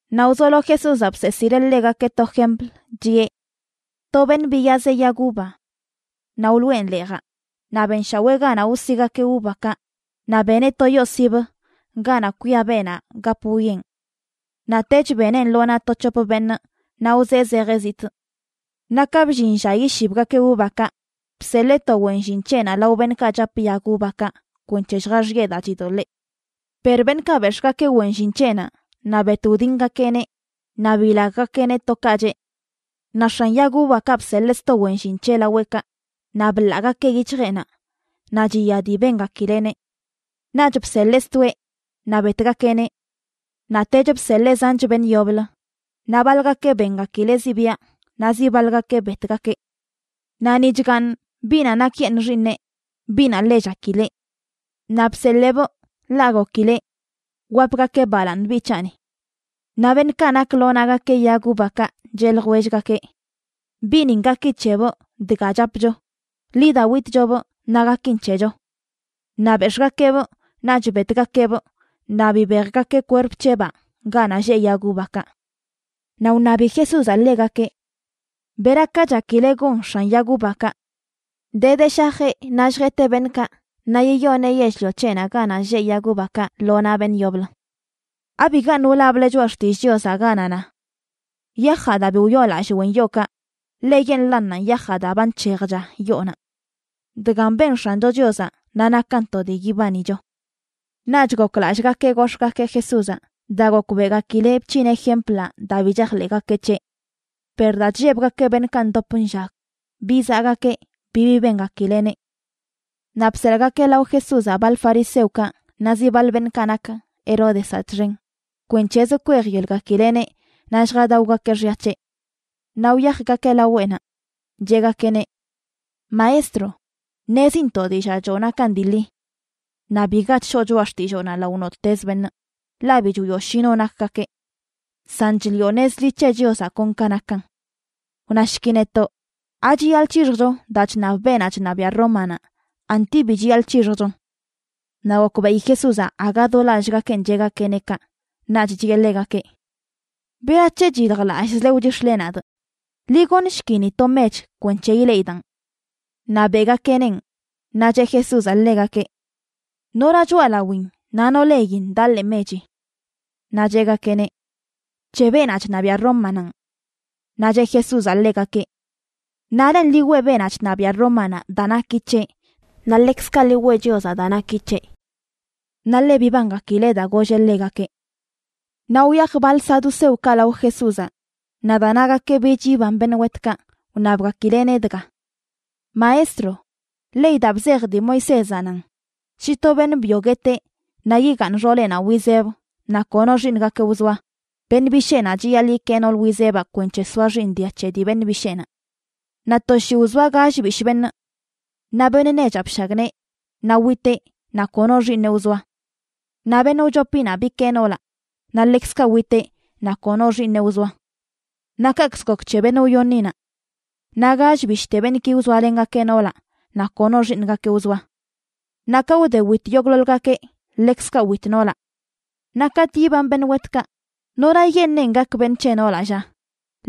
Naꞌ wzolo Jesúzaꞌ bseesileꞌ ḻegakeꞌ to jempl, chiꞌe: ―To beṉꞌ biyazeꞌ yag uva. Naꞌ wloꞌen leejaꞌ, naꞌ benshawee ganaꞌ wsigakeꞌ uvakaꞌ, naꞌ beneꞌ to yoo sibə, ganaꞌ kwia beenaꞌ gap wwieꞌn. ’Naꞌtech beneꞌn lo naꞌ to c̱hop beṉꞌ naꞌ wzee zejeꞌ zitꞌ. Naꞌ ka bllin lla yishibgakeꞌ uvakaꞌ, bseḻee to wen llin c̱heꞌnaꞌ lao beṉꞌkaꞌ chap yag uvakaꞌ kwenc̱he lljaxiꞌe daa chidoḻee. Per beṉꞌkaꞌ bex̱ꞌgakeꞌ wen llin c̱heꞌnaꞌ, naꞌ bet wdingakeꞌneꞌ naꞌ bilaggakeꞌneꞌ to ka cheꞌ. Naꞌ x̱an yag uvakaꞌ bseḻee sto wen llin c̱heꞌ laweꞌkaꞌ, naꞌ bḻaagakeꞌ yic̱hjeꞌnaꞌ, naꞌ chiya dii bengakileꞌneꞌ. Naꞌch bseḻee stoeꞌ, naꞌ betgakeꞌneꞌ. Naꞌtech bseḻee zanch beṉꞌ yoblə; naꞌ baḻgakeꞌ bengakileꞌ zibiaꞌ, naꞌ zi baḻgakeꞌ betgakeꞌ. ’Naꞌ ni chgaaṉ biꞌnaꞌ nakyeṉꞌ xiiṉeꞌ, biꞌnaꞌ ḻe chakileꞌ. Naꞌ bseḻeebꞌ, ḻaꞌ gokileꞌ: “Wapgakeꞌ balaaṉ biꞌ c̱haꞌni.” Naꞌ beṉꞌkaꞌ nak lo naꞌgakeꞌ yag uvakaꞌ cheꞌ ljwellgakeꞌ: “Biꞌnin gaki c̱hebꞌ dga chapcho. Ḻi da witchobꞌ, naꞌ gakin c̱hecho.” Naꞌ bex̱ꞌgakeꞌbꞌ naꞌch betgakeꞌbꞌ naꞌ bibejgakeꞌ kwerp c̱hebaa ganaꞌ lleꞌ yag uvakaꞌ. Naꞌ wṉabi Jesúzaꞌ ḻegakeꞌ: ―¿Beraka chakile gon x̱an yag uvakaꞌ? De de shajeꞌ naꞌ lljeteꞌ beṉꞌkaꞌ naꞌ yiyoneꞌ yell-lio c̱heꞌnaꞌ ganaꞌ lleꞌ yag uvakaꞌ lo naꞌ beṉꞌ yoblə. ’¿Abigaṉꞌ wlable Choꞌa Xtillꞌ Chiozaꞌ?, ganaꞌ na: Yajaꞌ daa bi wyoolallꞌ wen yookaꞌ, ḻeyeṉꞌlannanꞌ yajaꞌ daa ba nc̱hejcha yoonaꞌ. Dgan ben X̱ancho Chiozaꞌ naꞌ nakan to dii yibanicho. Naꞌch goklallꞌgakeꞌ gox̱ꞌgakeꞌ Jesúzaꞌ daa gokbeꞌgakileꞌ bc̱hineꞌ jemplaꞌ daa bi chajḻeꞌgakeꞌ c̱heꞌ. Per daa chllebgakeꞌ beṉꞌkaꞌ ndop nllag, bizaꞌgakeꞌ bibi bengakileꞌneꞌ. Naꞌ bseḻꞌgakeꞌ lao Jesúzaꞌ baḻ fariseokaꞌ naꞌ zi baḻ beṉꞌkaꞌ nak Heródezaꞌ txen, kwenc̱hezə kwejyelgakileꞌneꞌ naꞌ lljadaogakeꞌ xya c̱heꞌ. Naꞌ wyajgakeꞌ laweꞌnaꞌ, cheꞌgakeꞌneꞌ: ―Maestro, ṉezintoꞌ dillaa choo nakan dii ḻi. Naꞌ biga chshoo choꞌa xtilloonaꞌ lao nottez beṉꞌ, ḻaꞌ bi chwioꞌ shi no nakgakeꞌ. San chliꞌo nez ḻi c̱he Chiozaꞌ kon ka nakan. Wnashki netoꞌ: ¿Achiyaḻꞌ c̱hixjcho daa chṉab beenaꞌ chṉabiaꞌ Rómanaꞌ, anti bi chiyaḻꞌ c̱hixjchon? Naꞌ gokbeꞌi Jesúzaꞌ aga do lallꞌgakeꞌn cheꞌgakeꞌneꞌ kaꞌ, naꞌch chiꞌe ḻegakeꞌ: ―¿Berac̱he chyiljlallꞌzle wchix̱le nadꞌ? Ḻi goṉshki ni to mech kwenc̱he ileꞌidaꞌn. Naꞌ beꞌgakeꞌneꞌn, naꞌ cheꞌ Jesúzaꞌ ḻegakeꞌ: ―¿Nora choꞌalawin naꞌ no lein daꞌ ḻee mechi? Naꞌ cheꞌgakeꞌneꞌ: ―C̱he beenaꞌ chṉabiaꞌ Rómananꞌ. Naꞌ cheꞌ Jesúzaꞌ ḻegakeꞌ: ―Naꞌlen ḻi weꞌ beenaꞌ chṉabiaꞌ Rómanaꞌ daa naki c̱heꞌ, naꞌ ḻekzkaꞌ ḻi weꞌ Chiozaꞌ daa naki c̱heꞌ. Naꞌ ḻe bibangakileꞌ daa golleꞌ ḻegakeꞌ. Naꞌ wyaj baḻ saduceokaꞌ lao Jesúzaꞌ. Naꞌ daa nagakeꞌ bich yiban beṉꞌ wetkaꞌ, wṉabgakileꞌneꞌ dga: ―Maestro, ley daa bzej dii Moisézaꞌ nan shi to beṉꞌ byo gueteꞌ naꞌ yigaaṉ xooleꞌnaꞌ wizeb naꞌ kono xiiṉgakeꞌ wzoa, beṉꞌ bisheenaꞌ chiyaḻꞌ yikee nool wizebaꞌ kwenc̱he soa xiiṉ dia c̱he dii beṉꞌ bisheenaꞌ. Naꞌ to shii wzoa gall bishꞌ beṉꞌ. Naꞌ beṉꞌ nechaꞌ bshagnee, naꞌ witeꞌ naꞌ kono xiiṉeꞌ wzoa. Naꞌ beṉꞌ wchopinaꞌ bikee noolaꞌ, naꞌ ḻekzkaꞌ witeꞌ naꞌ kono xiiṉeꞌ wzoa. Naꞌ kaꞌkzə gok c̱he beṉꞌ wyoṉinaꞌ. Naꞌ gall bishꞌte beṉꞌki wzoalengakeꞌ noolaꞌ naꞌ kono xiiṉgakeꞌ wzoa. Naꞌ ka wde wit yogꞌḻoḻgakeꞌ, ḻekzkaꞌ wit noolaꞌ. Naꞌ katꞌ yiban beṉꞌ wetkaꞌ, ¿norayeṉꞌenꞌ gak beṉꞌ c̱he noolaꞌ, lla?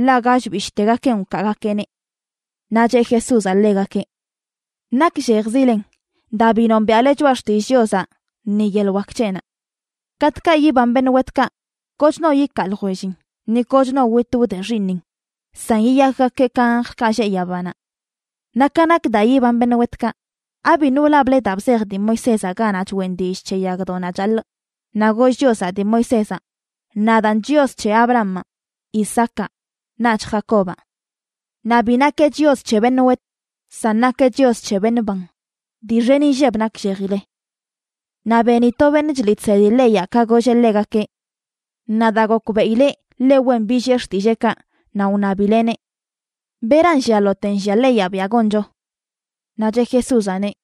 ḻaꞌ gall bishꞌtegakenꞌ wkaagakeꞌneꞌ. Naꞌ cheꞌ Jesúzaꞌ ḻegakeꞌ: ―Nakllejzilen, daa bi nombiaꞌle Choꞌa Xtillꞌ Chiozaꞌ ni yeḻꞌ wak c̱heꞌnaꞌ. Katꞌkaꞌ yiban beṉꞌ wetkaꞌ, koch no ikaa ljwellin, ni koch no witꞌ wde xiiṉin, san yiyakgakeꞌ ka anjlkaꞌ lleꞌ yabanaꞌ. Naꞌ ka nak daa yiban beṉꞌ wetkaꞌ, ¿abiṉꞌ wlable daa bzej dii Moisézaꞌ ganaꞌ choꞌen dillꞌ c̱he yagdoꞌnaꞌ chaḻꞌ, naꞌ goll Chiozaꞌ dii Moisézaꞌ: “Nadaan Chios c̱he Abrahamaꞌ, Isaacaꞌ, naꞌch Jacobaꞌ”? Naꞌ bi nakeꞌ Chios c̱he beṉꞌ wet, san nakeꞌ Chios c̱he beṉꞌ ban. Dii xen inlleb nakllejile. Naꞌ beni to beṉꞌ chliꞌ chsedi leyaꞌ ka golleꞌ ḻegakeꞌ. Naꞌ daa gokbeꞌileꞌ ḻe wen billiꞌe xtilleekaꞌ, naꞌ wṉabileꞌneꞌ: ―¿Beran llialote nllia leyaꞌ biaꞌ goncho? Naꞌ cheꞌ Jesúzaꞌneꞌ: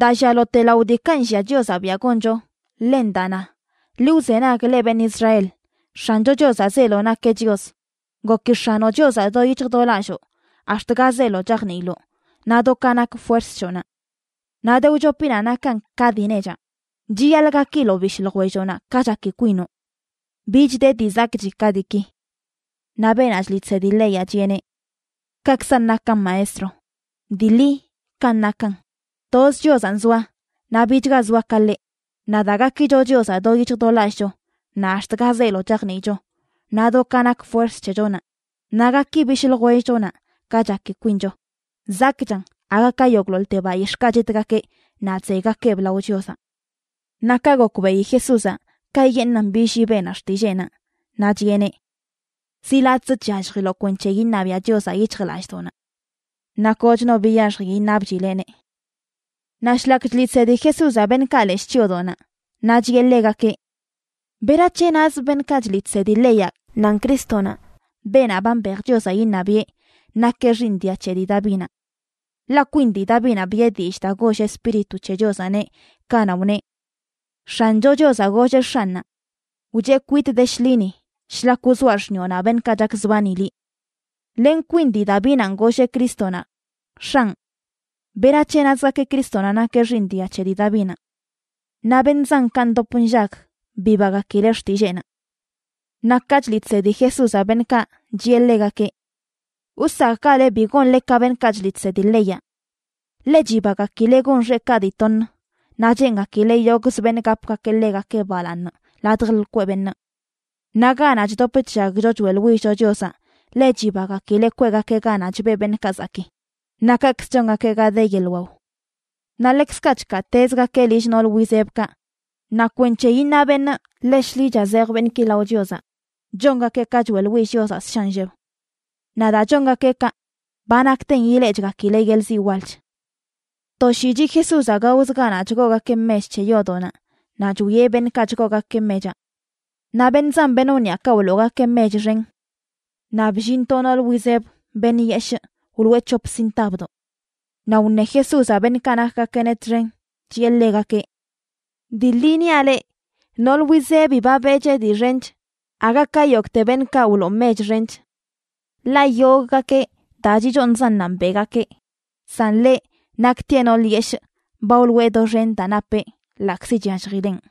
―Daa llialote lao diikaꞌ nllia Chiozaꞌ biaꞌ goncho, ḻen daa na: “Ḻi wzenag, leꞌ beṉꞌ Israel, X̱ancho Chiozaꞌ zeelo nakeꞌ Chios. Goki X̱anoꞌ Chiozaꞌ do yic̱hj do lalloo, ax̱t ga zeelo chajniiloꞌ, naꞌ do ka nak fuerz c̱hoꞌnaꞌ.” Naꞌ de wchopinaꞌ nakan ka dii nechaꞌ: “Chiyaḻꞌ gakiloꞌ bishꞌ ljwelloꞌnaꞌ ka chaki kwinoꞌ.” Bich de dii zakꞌchi ka diiki. Naꞌ beenaꞌ chliꞌ chsedi leyaꞌ chiꞌeneꞌ: ―Kakzan nakan, Maestro. Dii ḻi kanꞌ nakan: toz Chiozanꞌ zoa, naꞌ bichga zoa ka ḻeꞌ. Naꞌ daa gakicho Chiozaꞌ do yic̱hj do lallꞌcho, naꞌ ax̱t ga zeelo chajniicho, naꞌ do ka nak fuerz c̱hechonaꞌ, naꞌ gaki bishꞌ ljwellchonaꞌ ka chaki kwincho, zakꞌchan aga ka yogꞌḻoḻte bayix̱ꞌkaꞌ chitgakeꞌ naꞌ chzeygakeꞌb lao Chiozaꞌ. Naꞌ ka gokbeꞌi Jesúzaꞌ kayeṉꞌnan billii beenaꞌ xtilleenaꞌ, naꞌ chiꞌeneꞌ: ―Zi latꞌzə chyalljiloꞌ kwenc̱he iṉabiaꞌ Chiozaꞌ yic̱hjlallꞌdoꞌnaꞌ. Naꞌ koch no biyaxji iṉabchileꞌneꞌ. Naꞌ shlak chliꞌ chsedi Jesúzaꞌ beṉꞌkaꞌ leshꞌ chyoodoꞌnaꞌ, naꞌ chiꞌe ḻegakeꞌ: ―¿Berac̱he nazə beṉꞌkaꞌ chliꞌ chsedi leyaꞌ nan Crístonaꞌ, beenaꞌ ba mbej Chiozaꞌ iṉabiꞌe, nakeꞌ xiiṉ dia c̱he dii Davinaꞌ? Ḻaꞌ kwin dii Davinaꞌ biꞌe dillꞌ daa goll Espíritu c̱he Chiozaꞌneꞌ, kanaꞌ wneꞌ: X̱ancho Chiozaꞌ golleꞌ X̱anꞌnaꞌ: “Wcheꞌ kwitꞌ de shḻini, shlak wzoaꞌ xṉiꞌonaꞌ beṉꞌkaꞌ chakzbani liꞌ.” Len kwin dii Davinanꞌ golleꞌ Crístonaꞌ: X̱anꞌ, ¿berac̱he nazgakeꞌ Crístonaꞌ nakeꞌ xiiṉ dia c̱he dii Davinaꞌ? Naꞌ beṉꞌ zankaꞌ ndop nllag bibagakileꞌ xtilleenaꞌ. Naꞌ ka chliꞌ chsedi Jesúzaꞌ beṉꞌkaꞌ, chiꞌe ḻegakeꞌ: ―Wsakꞌgale bi gonle ka beṉꞌkaꞌ chliꞌ chsedi leyaꞌ. Ḻe chibagakileꞌ gon xeꞌkaꞌ dii toṉ, naꞌ cheengakileꞌ yogꞌzə beṉꞌ gapgakeꞌ ḻegakeꞌ balaaṉ ladj lkweꞌ beṉꞌ. Naꞌ ganaꞌ chdop chllagcho choeꞌḻwillcho Chiozaꞌ ḻe chibagakileꞌ kweꞌgakeꞌ ganaꞌ chbeꞌ beṉꞌkaꞌ zakii, naꞌ kaꞌkzə chongakeꞌ ga de yeḻꞌ wao. Naꞌ ḻekzkaꞌ chkaatezgakeꞌ lill nool wizebkaꞌ, naꞌ kwenc̱he iṉa beṉꞌ ḻe shḻicha zej beṉꞌki lao Chiozaꞌ, chongakeꞌ ka choeꞌḻwill Chiozaꞌ ssha nlleb. Naꞌ daa chongakeꞌ kaꞌ, ba nakten ileꞌchgakileꞌ yeḻꞌ ziꞌ walch. To shii chiꞌ Jesúzaꞌ gaozə ganaꞌ chgoogakeꞌ mech c̱he yoodoꞌnaꞌ naꞌ chwieꞌ beṉꞌkaꞌ chgoogakeꞌ mechaꞌ. Naꞌ beṉꞌ zan beṉꞌ wniꞌakaꞌ wloogakeꞌ mech xen. Naꞌ bllin to nool wizeb, beṉꞌ yeshꞌ, wloꞌe c̱hop sintabdoꞌ. Naꞌ wṉe Jesúzaꞌ beṉꞌkaꞌ nakgakeꞌneꞌ txen, chiꞌe ḻegakeꞌ: ―Dii ḻi niaꞌ leꞌ, nool wizebi ba beꞌcheꞌ dii xench aga ka yogꞌte beṉꞌkaꞌ wloo mech xench. Ḻaꞌ yogꞌgakeꞌ daa chichooṉzannanꞌ beꞌgakeꞌ, san ḻeꞌ, naktieꞌ nool yeshꞌ, ba wloꞌe doxen daa napeꞌ ḻaꞌkzi chyalljileꞌn.